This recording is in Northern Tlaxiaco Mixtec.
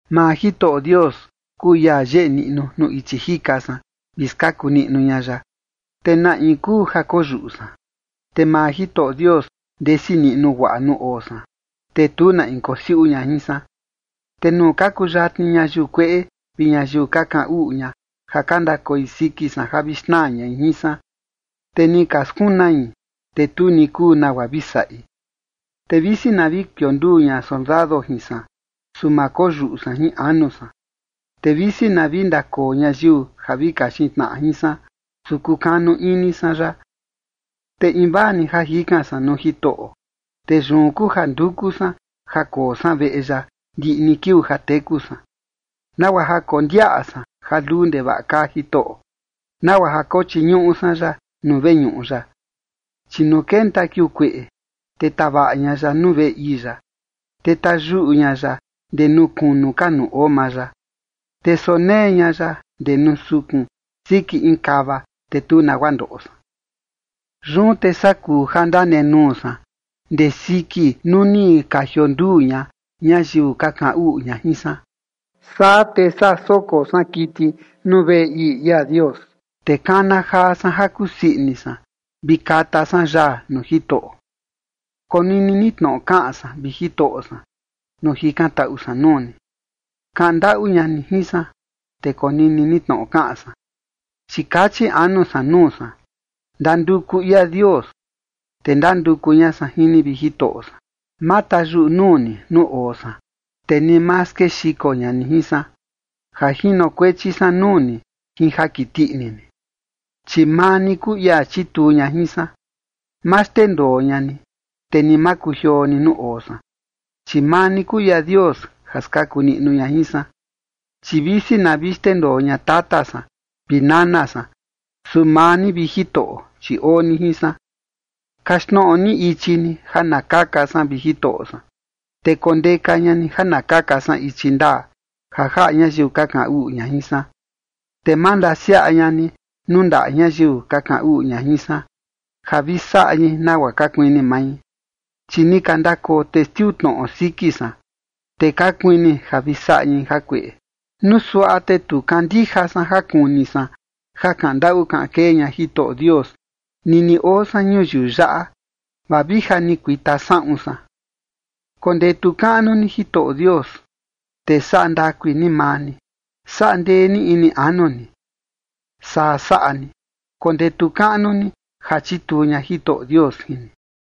Maa Jitoꞌo Dios kuu ia yeꞌe niꞌnu nuu ichi jika san, vi skaku niꞌnu ña ya. ¿Te na in kuu ja koyuꞌu san? Te maa Jitoꞌo Dios ndesi niꞌnu guaꞌa nuu oo san, te tu na in kosiuꞌu ña jin san. Te nuu ka kuyatni ñayiu kueꞌe vi ñayiu ka kaꞌan uꞌu ña ja ka ndakoi siki san ja vi xnaa ñai jin san, te ni ka skunai, te tu ni kuu nagua vi saꞌi. Te visi na vi kionduu ña soldado jin san, su ma koyuꞌu san jin anu san. Te visi na vi ndakoo ñayiu ja vi kaxin tnaꞌa jin san, su kukanu ini san ya. Te invaa ni ja jikan san nuu Jitoꞌo, te yun kuu ja nduku san ja koo san veꞌe ya ndiꞌi ni kiuu ja teku san, nagua ja kondiaꞌa san ja luu ndevaꞌa kaa Jitoꞌo, nagua ja kochiñuꞌu san ya nuu veñuꞌu ya. Chi nuu kenta kiuu kueꞌe, te tavaꞌa ña ya nuu veꞌe ii ya, te tayuꞌu ña ya ndee nuu kunu ka nuu oo maa ya, te sonee ña ya ndee nuu sukun, siki in kava, te tu nagua ndoꞌo san. Yun te saa kuu ja ndanenuu san ndee siki nuu ni ka jionduu ña, ñayiu ka kaꞌan uꞌu ña jin san. Saa te saa soko san kiti nuu veꞌe ii ia Dios, te kana jaa san ja kusii ini san, vi kata san yaa nuu Jitoꞌo. Konini ni tnoꞌo kaꞌan san, vi Jitoꞌo san, nuu jikantaꞌu san nuu ni. Kaꞌan ndaꞌu ña ni jin san, te konini ni tnoꞌo kaꞌan san. Chi kachi anu san nuu san: “Ndanduku ia Dios”. Te ndanduku ña san jin ni, vi Jitoꞌo san. Ma tayuꞌu nuu ni nuu oo san, te ni ma skexiko ña ni jin san ja jinokuechi san nuu ni jin ja kiti ini ni, chi maa ni kuu ia chituu ña jin san. Ma xndendoo ña ni, te ni ma kujioo ni nuu oo san, chi maa ni kuu ia Dios ja skaku niꞌnu ña jin san. Chi visi na vi xndendoo ña tata san vi nana san, su maa ni, vi Jitoꞌo, chi oo ni jin san. Kaxtnoꞌo ni ichi ni ja na kaka san, vi Jitoꞌo san, te kondeka ña ni ja na kaka san ichi ndaa, ja jaꞌa ñayiu ka kaꞌan uꞌu ña jin san. Te ma ndasiaꞌa ña ni nuu ndaꞌa ñayiu ka kaꞌan uꞌu ña jin san, ja vi saꞌa ñai nagua ka kuini mai, chi ni ka ndakoo testiu tnoꞌo siki san, te ka kuini ja vi saꞌa ñai jakueꞌe. Nuu suaꞌa te tu kandija san ja kuni san ja kaꞌan ndaꞌu kaꞌan kee ña Jitoꞌo Dios nini oo san ñuyiu yaꞌa, vaa vi ja ni kuita saꞌun san. Kondetu kaꞌnu ni Jitoꞌo Dios, te saꞌa ndakui ni maa ni. Saꞌa ndee ni ini anu ni. Saa saꞌa ni, kondetu kaꞌnu ni ja chituu ña Jitoꞌo Dios jin ni.